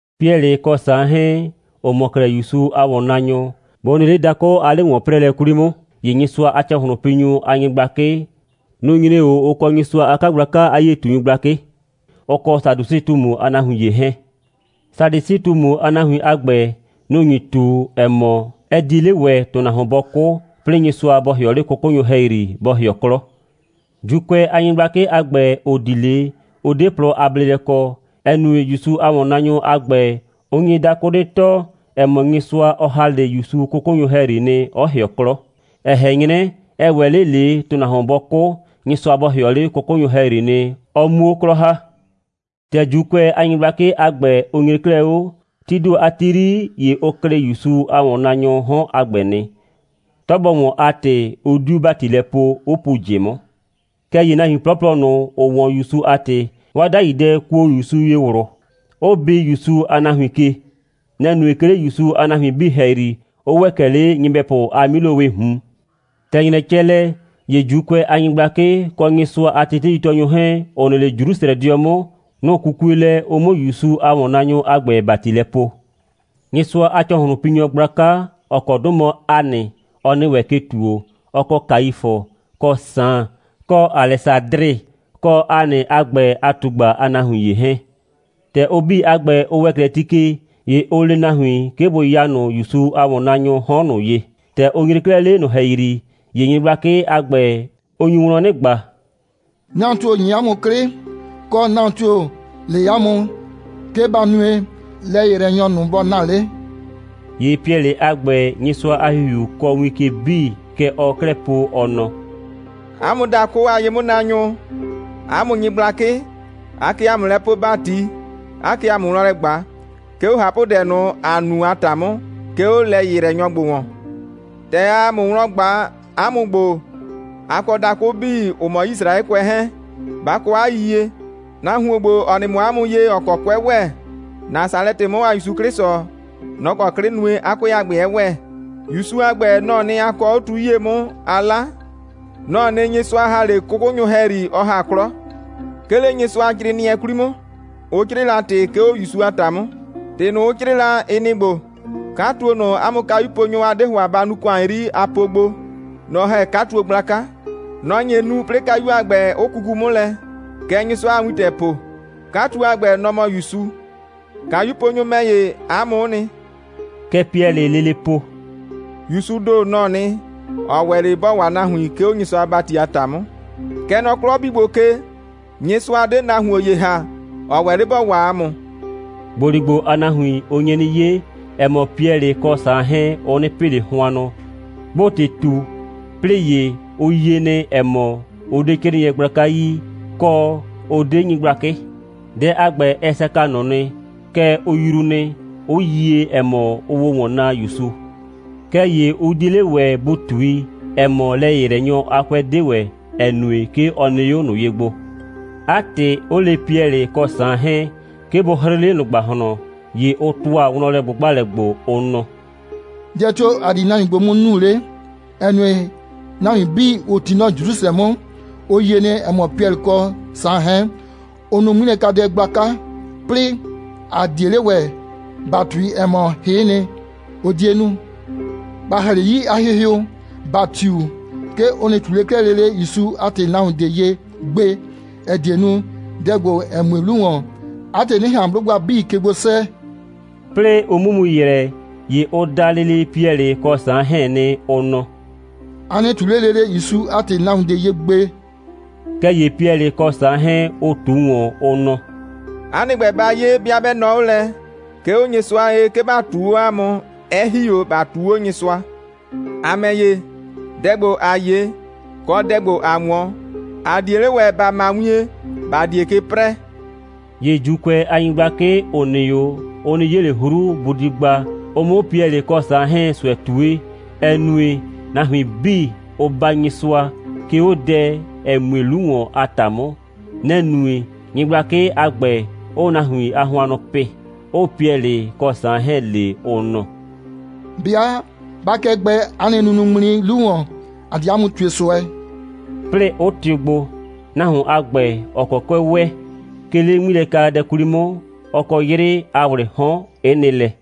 Piɛlɩ kɔ Saan 'hɛɛn, ‑ʋ mɔ 'klɛɛ ‑Yusu a ‑wɔnnaanyʋ, bʋ nɩ 'le dakʋ a 'le‑wɔn'prɛɛlɛ 'kwli 'mʋ, ‑ye Nyɩsʋa a ‑cɔhlʋnpinyʋ a nyɩgblakɩ, nʋ‑ nyre 'o, ʋ kɔ Nyɩsʋa a 'kagblaka a 'yie꞊tunyʋ a nyɩgblakɩ, ʋ kɔ Sadusɩ꞊tumu a nahuin ‑ye 'hɛɛn. (Sadusɩ꞊tumu a nahuin a ‑gbɛ, nʋ‑ nyi ꞊tu, ‑ɛ mɔ, ɛ 'die 'le ‑wɛ, ‑tʋnahuon 'bɔ 'kʋ, 'plɩɩ Nyɩsʋa bɔ ‑hɩɔ 'le 'kʋkʋnyʋ ‑hɛyri, bɔ ‑hɩɔ 'klɔ.) ‑Juukʋɛ a nyɩgblakɩ a ‑gbɛ, ‑ʋ di 'le, ʋ 'de plɔ a bleelɛ kɔ, ‑ɛ nue, ‑Yusu a ‑wɔnnaanyʋ a ‑gbɛ, ʋ nye dakʋ 'nɩ tɔɔ, ‑ɛ mɔ, Nyɩsʋa, ɔ ‑ha 'le ‑Yusu 'kʋkʋnyʋ ‑hɛyri nɩ, 'ɔ ‑hɩɔ 'klɔ, ɛ ꞊hɛn 'nyrɛ, ɛ ‑wɛ 'le ꞊le, ‑tʋnahuon 'bɔ 'kʋ, Nyɩsʋa bɔ ‑hɩɔ 'le 'kʋkʋnyʋ ‑hɛyri, ɔ 'muo 'klɔ ‑ha. ‑Tɛ ‑Juukʋɛ a nyɩgblakɩ a ‑gbɛ, ʋ nyre 'klɛɛ 'o, tii ‑do a ti 'yri, ‑ye ʋ klɩ ‑Yusu a ‑wɔnnaanyʋʋ 'hɔn a ‑gbɛ nɩ. 'Tɔ bɔ ‑wɔn a ‑tɩ, 'ʋ 'diu ‑bati lɛ poo, 'ʋ pu ꞊jɩ 'mʋ. Kɛɛ ‑ye nahuin 'plɔplɔ ꞊nʋ, ‑ʋ 'wɔn ‑Yusu a ‑tɩ, 'waa 'dai dɛ kuo ‑Yusu ye ꞊wlʋ, 'ʋ bi ‑Yusu a nahuin ke. Nɛ‑ nue, 'ke 'le ‑Yusu a nahuin 'bii ‑hɛyri, 'ʋ ‑wɛ kɛ 'le nyɩbɛpʋ a 'milowɩɩ ꞊hun. ‑Tɛ ‑nyrɛ cɛ lɛ, ‑ye ‑Juukʋɛ a nyɩgblakɩ, kɔ Nyɩsʋa a teteitɔɔnyʋ 'hɛɛn, ‑ʋ nɩ 'le Jrusrɛdɩɔ 'mʋ, nʋ‑ 'kukue lɛ, ʋ 'mʋ ‑Yusu a ‑wɔnnaanyʋ a ‑gbɛ ‑bati lɛ poo. Nyɩsʋa a ‑cɔhlʋnpinyʋ a nyɩgblaka, ‑ɔ kɔ 'dʋ mɔ Hanɩ, ɔ nɩ ‑wɛ ke ‑tuo, ɔ kɔ Kaifʋ, kɔ Saan, kɔ Alɛsadrɩ, kɔ Hanɩ a ‑gbɛ a ꞊tugba a nahuin ‑ye 'hɛɛn. ‑Tɛ ʋ 'bii a ‑gbɛ, ʋ ‑wɛ 'klɛɛ ti ke, ‑ye ʋ le nahuin, 'ke bʋ ya ꞊nʋ ‑Yusu a ‑wɔnnaanyʋʋ 'hɔn ꞊nʋ ye. ‑Tɛ ʋ nyre 'klɛɛ 'le ꞊nʋ ‑hɛyri, ‑ye nyɩgblakɩ a ‑gbɛ, ʋ nyu wlɔn 'nɩ ꞊gba: «Nahuon tio‑ ‑nye 'a mʋ 'klɩ, kɔ, nahuon tio‑ le 'a mʋ, 'ke ba nue, lɛ‑yɩyrɛnyɔ ꞊nʋ bɔ na 'le?» ‑Ye Piɛlɩ a ‑gbɛ, Nyɩsʋa a ‑Hihiu kɔɔ win ke 'bii, kɛ ɔɔ 'klɛɛ po, ɔ nɔ: «'A mʋ dakʋ a ye'mʋnaanyʋ, 'a mʋ nyɩgblakɩ, aa kɛ ‑a mʋ lɛ poo ‑bati, 'aa kɛ ‑a mʋ wlɔn ꞊gba, 'ke 'o ꞊hapʋdɛ ꞊nʋ, ‑a nu a ‑ta 'mʋ, 'ke 'o lɛ‑yɩyrɛnyɔ ‑gbo ‑wɔn. ‑Tɛ aa ‑a mʋ wlɔn ꞊gba, 'a mʋ ‑gbo, a kɔ dakʋ 'bii, ‑ʋ mɔ Yisraɛkʋɛ 'hɛɛn, ba kɔ 'a yiyie: Nahuon ‑gbo, ‑ɔ nɩ mɔ 'a mʋ ye, ‑ɔ kɔ 'kʋɛ ‑wɛ, Nasalɛtɩ 'mʋ a ‑Yusu 'Klɩsʋ, nɔ‑ kɔ 'klɩ nue, 'a 'kʋɛ a ‑gbɛ 'ɛ ‑wɛ. ‑Yusu a ‑gbɛ, nɔ‑ɔ nɩ, a kɔɔ 'o tu 'yie 'mʋ, a 'la. Nɔ‑ɔ nɩ, Nyɩsʋa ‑ha 'le 'kʋkʋnyʋ ‑hɛyri, ɔ ‑ha 'klɔ. 'Ke 'le Nyɩsʋacrɩɩnɩɛ 'kwli 'mʋ, ʋ 'crɩɩ la ‑tɩ, 'ke 'o ‑Yusu a ‑ta 'mʋ. ‑Tɩ ꞊nʋ, ʋ 'crɩɩ la, ɩ nɩ‑ ‑gbo: 'Katuo ꞊nʋ, 'a mʋ kayuponyʋ, a 'de ‑hʋa ba nuu ‑kʋan 'yri, a po gbo, nɔ‑ ‑hɛ 'katuo gblaka. Nɔ‑ nye nu, 'plɩɩ kayu a ‑gbɛ, 'ʋ kuku 'mʋ lɛ. Kɛ Nyɩsʋa a wintɛ po. 'Katuo a ‑gbɛ, nɔ‑ mɔ ‑Yusu. (Kayuponyʋ ‑mɛ ‑ye, 'a mʋ'ʋ nɩ.)» Kɛ Piɛlɩɩ lele po: «‑Yusuu ‑do, nɔ‑ɔ nɩ, ‑ɔ ‑wɛ 'le ‑bɔ waa nahuin, 'ke 'o Nyɩsʋa a ‑bati a ‑ta 'mʋ. Kɛ nɔ 'klɔ 'bii ‑gbo ke, Nyɩsʋa 'de nahuon ‑ye ‑ha, ‑ɔ ‑wɛ 'le ‑bɔ waa ‑a mʋ.» ‑Gboligbo a nahuin, ʋ nye 'nɩ 'ye, ‑ɛ mɔ, Piɛlɩ kɔ Saan 'hɛɛn, ʋ 'nɩ pɩ ꞊le hʋannʋ, 'bʋʋ ‑tɩ ꞊tu, 'plɩɩ ‑ye, ʋ yie nɩ, ‑ɛ mɔ, ʋ 'de 'crɩɩnɩɛ gblaka yi, kɔ, ʋ 'de nyɩgblakɩ. Dɛ a ‑gbɛ, ɛ saka ꞊nʋ nɩ. Kɛɛ, ʋ yruu nɩ, 'ʋ yie, ‑ɛ mɔ, ʋʋ o ‑wɔn naa ‑Yusu. Kɛɛ ‑ye ʋ 'die 'le ‑wɛ bʋ ꞊tui, ‑ɛ mɔ, lɛ‑yɩyrɛnyɔ a 'kʋɛ 'de ‑wɛ, ‑ɛ nue, 'ke ɔ nɩ 'o ꞊nʋ ye gbo. 'A ‑tɩ, 'ʋ le Piɛlɩ kɔ Saan 'hɛɛn, 'ke bʋ 'hrɩɩ 'le ꞊nʋ ‑gbahlɔn, ‑ye ʋ ‑tʋa wlɔnlɛ꞊gbʋgbalɛ gbo, ʋ nɔ: «Dɛ tio‑ ‑a di nahuin ‑gbo 'mʋ nu 'le, ‑ɛ nue, nahuin 'bii, ‑ʋ 'ti nɔ Jrusrɛ 'mʋ, ʋ yie nɩ, ‑ɛ mɔ, Piɛlɩ kɔ Saan 'hɛɛn, ʋ nu 'ŋmilɛkadɛ gblaka. 'Plɩɩ, ‑a 'die 'le ‑wɛ ‑ba ꞊tui, ‑ɛ mɔ, hɩ'ɩ nɩ, ʋ 'die nu. ‑Ba ‑ha 'le 'yii a hɩhɩʋ, ‑ba tiu, 'ke ʋ nɩ ꞊tu 'le 'klɛɛ lele ‑Yusu a ‑tɩ nahuon ꞊de ye gbe, ‑ɛ die nu, dɛ ‑gbo, ‑ɛ mue 'lu ‑wɔn, 'a ‑tɩ 'nɩ ꞊han 'blʋgba 'bii ke gbo 'sɛɛ.» 'Plɩɩ ʋ 'mʋ mu ‑yrɛ, ‑ye ʋ da lele Piɛlɩ kɔ Saan 'hɛɛn nɩ, ʋ nɔ: «A nɩ ꞊tu 'le lele ‑Yusu a ‑tɩ nahuon ꞊de ye gbe!» Kɛɛ ‑ye Piɛlɩ kɔ Saan 'hɛɛn, ʋ ꞊tu ‑wɔn, ʋ nɔ: «'A nɩ ‑gbɛ, ba 'ye, 'bɩa 'bɛ nɔɔ 'o lɛ, 'ke 'o Nyɩsʋa ye, 'ke ‑ba ꞊tuu 'o 'a mʋ, 'ɛ ‑hi 'o ‑ba ꞊tuu 'o Nyɩsʋa. ‑A ‑mɛ ‑ye, dɛ ‑gbo, ‑a 'ye, kɔ ‑tɩ ‑gbo, ‑a 'wɔn, ‑a 'die 'le ‑wɛ, ‑ba ma wien, ‑ba 'die ke 'prɛɛ.» ‑Ye ‑Juukʋɛ a nyɩgblakɩ, ‑ʋ nɩ 'o, ʋ 'nɩ 'ye ꞊le 'hru, bʋ di gba, ʋ 'mʋ Piɛlɩ kɔ Saan 'hɛɛn ꞊sʋɛ ꞊tue, ‑ɛ nue, nahuin 'bii, ʋʋ baa Nyɩsʋa, 'ke 'o dɛ, ‑ɛ mue 'lu ‑wɔn a ‑ta 'mʋ. Nɛ‑ nue, nyɩgblakɩ a ‑gbɛ 'ʋʋ nahuin a hʋannʋ pɩ, 'ʋʋ Piɛlɩ kɔ Saan 'hɛɛn le, ʋ nɔ: «'Bɩa 'ba 'kɩɛ gbɛɛ 'a nɩ nunuŋmli 'lu ‑wɔn, ‑a di 'a mʋ ꞊tue ꞊sʋɛ,» 'plɩɩ, 'ʋ tɩʋ gbo. Nahuon a ‑gbɛ, ‑ɔ kɔ 'kʋɛ ‑wɛ, 'ke 'le 'ŋmilɛkadɛ 'kwli 'mʋ, ɔ kɔ 'yrɩɩ a ‑wlɩɩ 'hɔn, 'ɩ nɩ lɛ.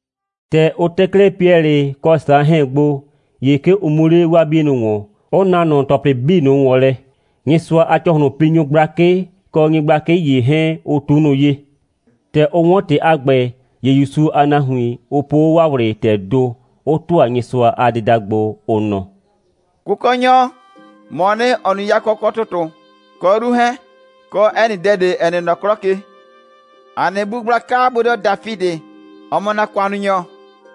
‑Tɛ ʋ tɛ 'klɛɛ Piɛlɩ kɔ Saan 'hɛɛn gbo, ‑ye 'ke ʋ mu 'le 'waa 'bienʋ ‑wɔn, 'ʋ na ꞊nʋ ‑tɔplɩ 'bii ꞊nʋ ‑wɔn lɛ, Nyɩsʋa a ‑cɔhlʋnpinyʋ gblakɩ kɔ nyɩgblakɩ ‑ye 'hɛɛn, ʋ ꞊tu ꞊nʋ ye. ‑Tɛ ʋ 'wɔn ‑tɩ a ‑gbɛ, ‑ye ‑Yusu a nahuin, ʋ po 'o 'waa ꞊wlɩ ‑tɛɛ ‑do, 'ʋ ‑tʋa Nyɩsʋa a dɩda gbo, ʋ nɔ: «Kʋkɔnyɔ, ‑mɔɔ nɩ, ‑ɔ nu yakɔ, kɔ ‑tʋtʋ, kɔ 'yru 'hɛɛn, kɔ 'ɛ nɩ dɛ ꞊de, ‑ɛ nɩ nɔ 'klɔ ke. ‑A nɩ bu gblaka bodɩɔ Dafidɩ, ‑ɔ mɔ ‑na ‑kʋannunyɔ,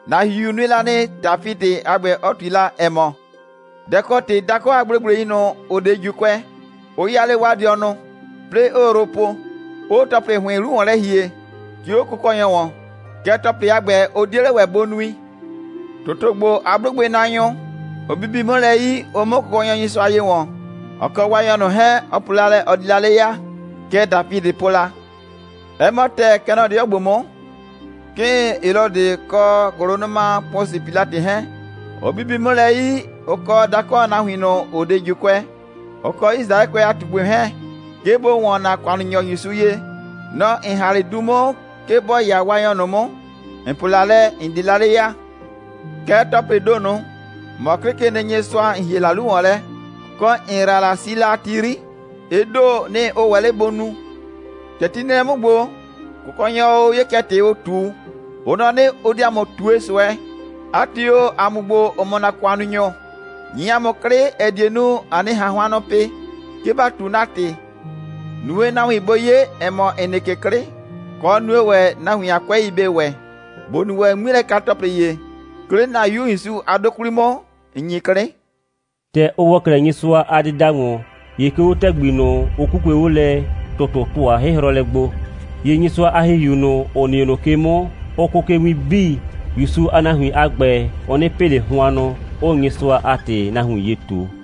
‑na ‑Hihiu nue la nɩ, Dafidɩ a ‑gbɛ 'ɔ ꞊tui la, ‑ɛ mɔ: Dɛ‑ kɔ ‑tɩ dakʋ a gblegblei ꞊nʋ, ‑ʋ 'de ‑Juukʋɛ, 'ʋ 'yaa 'le 'waa dɩɔnʋ, 'plɩɩ 'ʋʋ yrʋ po, 'ʋʋ ‑tɔplɩ ‑hʋɩn 'lu ‑wɔn lɛ ‑hie, 'ke 'o Kʋkɔnyɔ ‑wɔn. Kɛɛ, ‑tɔplɩ a ‑gbɛ, ʋ 'die 'le ‑wɛ bʋ nui. ‑Tʋtʋ ‑gbo a 'blʋgbɩnaanyʋ, ʋ bibi 'mʋ lɛ 'yi, ʋ 'mʋ Kʋkɔnyɔ Nyɩsʋa ye ‑wɔn, ɔ kɔ Waanyɔ ꞊nʋ 'hɛɛn, ɔ po la lɛ, ɔ di la 'le ya. Kɛ Dafidɩ po la. 'Ɛ mɔ ‑tɛɛ, kɛ nɔ 'dɩɔ ‑gbo 'mʋ, 'kɩɩn Helɔdɩ kɔ ‑gʋlʋnʋma Pʋsɩ Pilatɩ 'hɛɛn, ʋ bibi 'mʋ lɛ 'yi, ʋ kɔ dakʋ a nahuin ꞊nʋ, ‑ʋ 'de ‑Juukʋɛ, ʋ kɔ Yisraɛkʋɛ a ꞊tugbɩ 'hɛɛn, 'ke bʋ ‑wɔn ‑na ‑kʋannunyɔ ‑Yusu ye. Nɔ‑ ‑n ‑ha 'le du 'mʋ, 'ke bɔ 'ya Waanyɔ ꞊nʋ 'mʋ, ‑n po la lɛ, ‑n di la 'le ya. Kɛɛ, ‑tɔplɩɩ ‑do ꞊nʋ, ‑mɔ 'Klɩkenɩnyɩsʋa, ‑n ‑hie la 'lu ‑wɔn lɛ, kɔ ‑n ‑yra la, si la a ti 'yri, ɩ ‑do, nɩ‑ ʋ ‑wɛ 'le bʋ nu. ‑Tɛ ti nɩ lɛ 'mʋ ‑gbo, Kʋkɔnyɔ o, 'ye kɛ ‑tɩ ʋ ꞊tu, ʋ nɔ 'nɩ, ʋ di ‑a mʋ ꞊tue ꞊sʋɛ. 'A ‑tɩ o, ‑a mʋ ‑gbo, ‑ʋ mɔ ‑na ‑kʋannunyʋ, ‑nyi ‑a mʋ 'klɩ, ‑ɛ die nu, ‑a 'nɩ ꞊han hʋannʋ pɩ, 'ke ‑ba ꞊tu ‑na ‑tɩ. Nue, nahuin bʋ 'ye, ‑ɛ mɔ, ‑n nɩ ke 'klɩ. Kɔ, nue ‑wɛ, nahuin a 'kʋɛi bɩ ‑wɛ, ‑bo nu ‑wɛ 'ŋmilɛka‑tɔplɩ ‑ye, 'ke 'le ‑na 'Yu ‑Yusu a 'dʋ 'kwli 'mʋ, ‑n ‑nyi 'klɩ.» ‑Tɛ ʋ ‑wɔ 'klɛɛ Nyɩsʋa a dɩda ‑wɔn, ‑ye 'ke 'o ‑tɛgbi ꞊nʋ, ʋ 'kukue 'o lɛ, ‑tʋtʋ ‑tʋa 'hɩhrɔlɛ gbo. ‑Ye Nyɩsʋa a ‑Hihiu ꞊nʋ, ‑ʋ nɩ 'o ꞊nʋ ke 'mʋ, ʋ kʋʋ ke win 'bii, ‑Yusu a nahuin a ‑gbɛ, ʋ 'nɩ pɩ ꞊le hʋannʋ, 'ʋʋ Nyɩsʋa a ‑tɩ nahuin ye ꞊tu.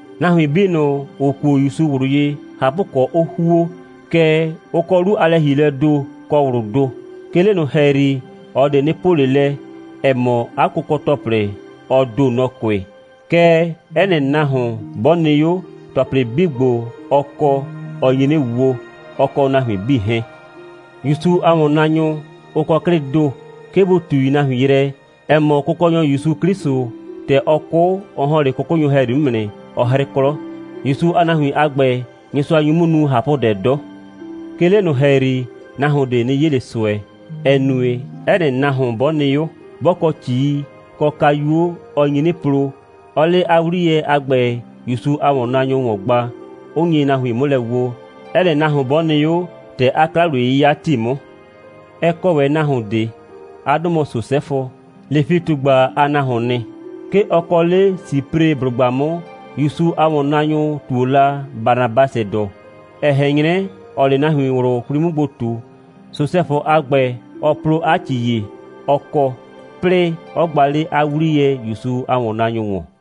Nahuin 'bii ꞊nʋ, ‑ʋ kuo ‑Yusu ꞊wlʋ ye, ꞊hapʋkɔ, 'ʋ ‑huo, kɛɛ, ʋ kɔ 'lu a lɛ‑hielɛɛ ‑do kɔ ꞊wlʋʋ ‑do. 'Ke 'le ꞊nʋ ‑hɛyri, ꞊ɔ ꞊de 'nɩ po ꞊le lɛ, ‑ɛ mɔ, 'a kʋkɔ‑tɔplɩ, ɔ ‑do, nɔ‑ kʋɩ, kɛɛ, 'ɛ nɩ nahuon, 'bɔ nɩ 'o, ‑tɔplɩ 'bii ‑gbo, ɔ kɔ, ɔ nyi 'nɩ wo, ɔ kɔ nahuin 'bii 'hɛɛn. ‑Yusu a ‑wɔnnaanyʋ, ʋ kɔ 'klɩ 'dɔ, 'ke bʋ ꞊tui nahuin yrɛ, ‑ɛ mɔ, Kʋkɔnyɔ ‑Yusu 'Klɩsʋ, ‑tɛ ɔ 'kʋ, ɔ ‑hɔn 'le 'kʋkʋnyʋ ‑hɛyri 'mʋ nɩ, 'ɔ 'hrɩ 'klɔ. ‑Yusu a nahuin a ‑gbɛ, Nyɩsʋa nyu 'mʋ nu ꞊hapʋdɛ 'dɔ. 'Ke 'le ꞊nʋ ‑hɛyri, nahuon ꞊de 'nɩ 'ye ꞊le ꞊sʋɛ, ‑ɛ nue, 'ɛ nɩ nahuon 'bɔ nɩ 'o, 'bɔ kɔ ‑cii kɔ kayuo, ɔ nyi 'nɩ plo, 'ɔɔ 'le 'a 'wliyɛ a ‑gbɛ ‑Yusu a ‑wɔnnaanyʋ ‑wɔn gba, 'ʋ nye nahuin 'mʋ lɛ woo, 'ɛ nɩ nahuon 'bɔ nɩ 'o, ‑tɛ 'a 'kla‑wliye'yɩya ‑ti 'mʋ. Ɛ kɔ ‑wɛ nahuon ꞊de. 'A 'dʋ mɔ Sosɛfʋ. Lefi꞊tugba a nahuoon nɩ. 'Ke ɔ kɔ 'le Sipreblʋgba 'mʋ, ‑Yusu a ‑wɔnnaanyʋ 'ʋ ꞊tuo la Banabasɩdʋ, ‑ɛ ꞊hɛn 'nyrɛ, ‑ɔɔ 'le nahuin ꞊wlʋ 'kwli 'mʋ gbo ꞊tu. Sosɛfʋ a ‑gbɛ, ɔ plo 'a ‑ci ‑ye, ɔ kɔ, 'plɩɩ, 'ɔ gba 'le 'a 'wliyɛ ‑Yusu a ‑wɔnnaanyʋ ‑wɔn.